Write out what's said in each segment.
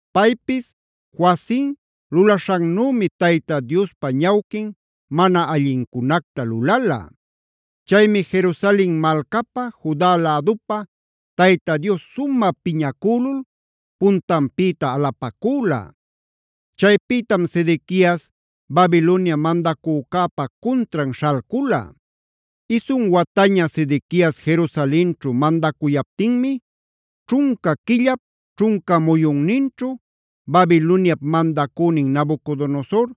Paypis Joacim lulaśhannümi, Tayta Diospa ñawquin mana allincunacta lulala. Chaymi Jerusalen malcapä, Juda lädupä Tayta Dios sumä piñacülul puntanpïta alapacüla. Chaypïtam Sedequias Babilonia mandacücäpa cuntran śhalcula. Isun wataña Sedequias Jerusalenćhu mandacuyaptinmi, ćhunca quillap ćhunca muyunninćhu Babiloniap mandacünin Nabucodonosor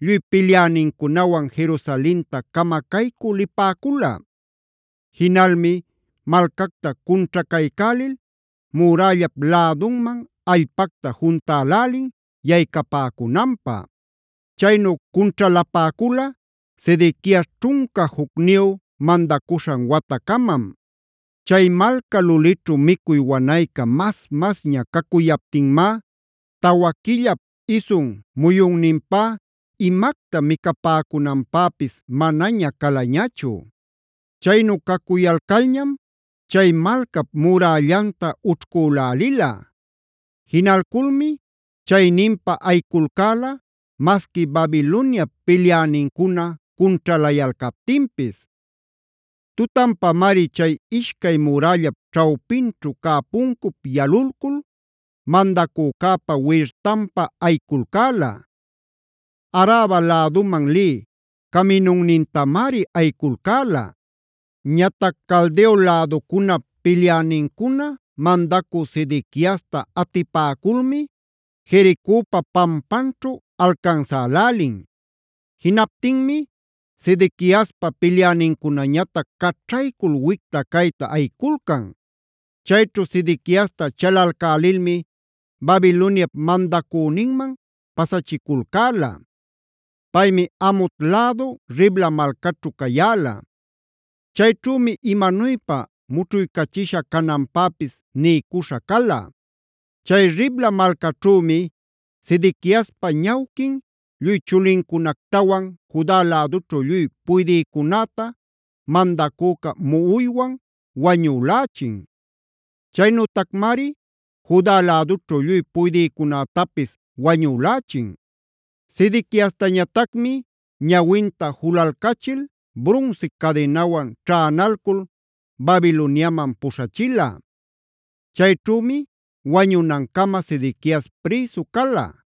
lluy pilyänincunawan Jerusalenta camacaycü lipäcula.a Jinalmi malcacta cunćhacaycälil murällap lädunman allpacta juntälälin yaycapäcunanpä. Chaynu cunćhalapäcula Sedequias ćhunca jucniyu mandacuśhan watacamam. Chay malca lulićhu micuy wanayca mas-masña cacuyaptinmá tawa quillap isun muyunninpá imacta micapäcunanpäpis manaña calañachu. Chaynu cacuyalcalñam chay malcapb murällanta ućhcülälila. Jinalculmi chayninpa ayiculcäla masqui Babiloniap pilyänincuna cunćhalayalcaptinpis. Tutanpamari chay ishcay murällap ćhawpinćhu cä puncup yalulcul mandacücäpa wirtanpa ayiculcäla; Araba läduman lï caminunnintamari ayiculcäla. Ñatac Caldeo läducunap pilyänincuna mandacü Sedequiasta atipäculmi Jericopa pampanćhu alcansälälin. Jinaptinmi Sedequiaspa pilyänincunañatac caćhaycul wicta-cayta ayiculcan. Chayćhu Sedequiasta chalalcälilmi Babiloniap mandacüninman pasachiculcäla. Paymi Hamat lädu Ribla malcaćhu cayäla. Chayćhümi imanuypa mućhuycachisha cananpäpis niycuśha cala. Chay Ribla malcaćhümi Sedequiaspa ñawquin lluy chulincunactawan Juda lädućhu lluy puydïcunäta mandacüca muꞌuywan wañülächin. Chaynütacmari Juda lädućhu lluy puydïcunätapis wañülächin. Sedequiastañatacmi ñawinta jululcachil brunsi cadinawan ćhänalcul Babiloniamanc puśhachila. Chayćhümi wañunancama Sedequias prïsu cala.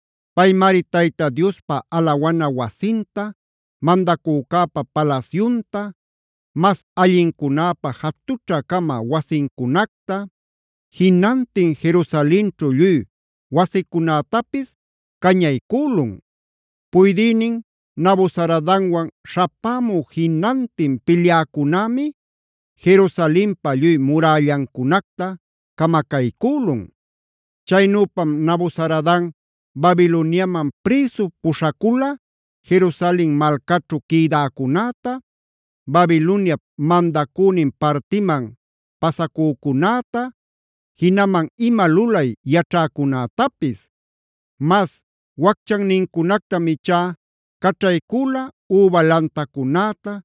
Paymari Tayta Diospa alawana wasinta, mandacücäpa palasyunta,d mas allincunäpa jatućha-cama wasincunacta, jinantin Jerusalenćhu lluy wasicunätapis cañaycülun. Puydïnin Nabuzaradanwan śhapämü jinantin pilyäcunämi Jerusalenpa lluy murällancunacta camacaycülun. Chaynüpam Nabuzaradan Babiloniaman prïsu puśhacula Jerusalen malcaćhu quïdäcunäta, Babiloniap mandacünin partiman pasacücunäta, jinaman ima lulay yaćhäcunätapis. Mas wacchannincunactam ichá caćhaycüla üba lantacunäta,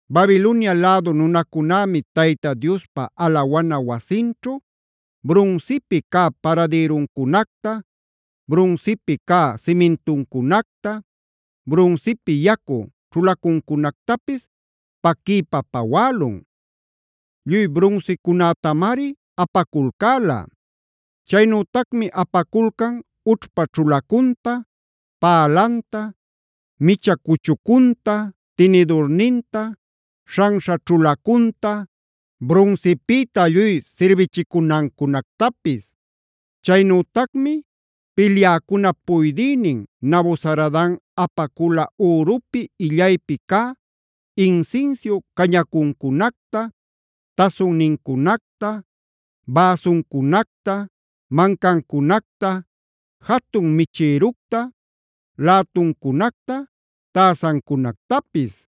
Babilonia lädu nunacunämi Tayta Diospa alawana wasinćhu brunsipi cä paradïruncunacta, brunsipi cä simintuncunacta, brunsipi yacu ćhulacuncunactapis paquiypa pawälun. Lluy brunsicunätamari apaculcäla. Chaynütacmi apaculcan ućhpa ćhulacunta, pälanta, micha cuchucunta, tinidurninta, śhanśha ćhulacunta, brunsipïta lluy sirbichicunancunactapis. Chaynütacmi pilyäcunap puydïnin Nabuzaradan apacula ürupi illaypi cä insinsiu cañacuncunacta, tasunnincunacta, bäsuncunacta, mancancunacta, jatun michïructa, lätuncunacta, täsancunactapis.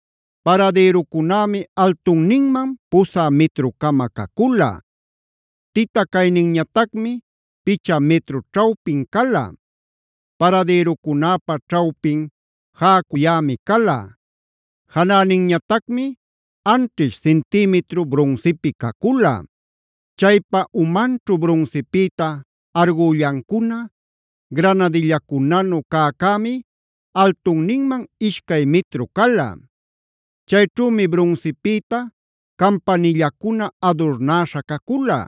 Paradïrucunämi altunninman pusä mitru-cama cacula; tita cayninñatacmi picha mitru ćhawpin cala. Paradïrucunäpa ćhawpin jäcuyämi cala; janäninñatacmi anćhish cintïmitru brunsipi cacula. Chaypa umanćhu brunsipïta argullancuna, granadillacunanu cäcämi altunninman ishcay mitru cala. Chayćhümi brunsipïta campanillacuna adurnäśha cacula.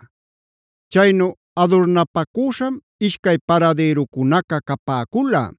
Chaynu adurnapacüśham ishcay paradïrucunaca capäcula.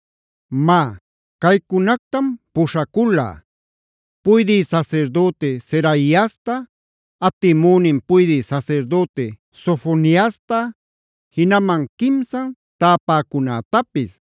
Má, caycunactam puśhacula: puydï sasirdüti Seraiasta, atimünin puydï sasirdüti Sofoniasta, jinaman quimsan täpäcunätapis.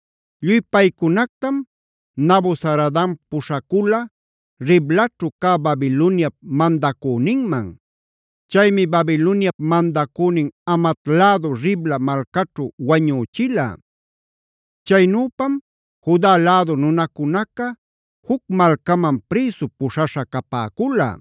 Lluy paycunactam Nabuzaradan puśhacula Riblaćhu cä Babiloniap mandacüninman. Chaymi Babiloniap mandacünin Hamat lädu Ribla malcaćhu wañüchila. Chaynüpam Juda lädu nunacunaca juc malcaman prïsu puśhaśha capäcula.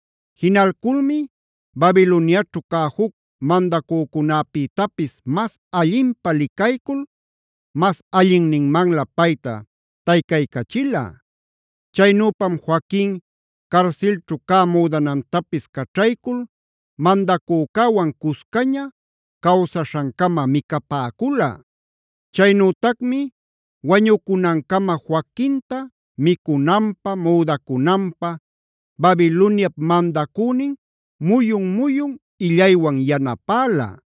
Jinalculmi Babiloniaćhu cä juc mandacücunäpïtapis mas allinpä licaycul mas allinninmanlä payta taycaycachila. Chaynüpam Joaquin carsilćhu cä müdanantapis caćhaycul mandacücäwan cuscaña cawsaśhancama micapäcula. Chaynütacmi wañucunancama Joaquinta micunanpä, müdacunanpä Babiloniap mandacünin muyun-muyun illaywan yanapäla.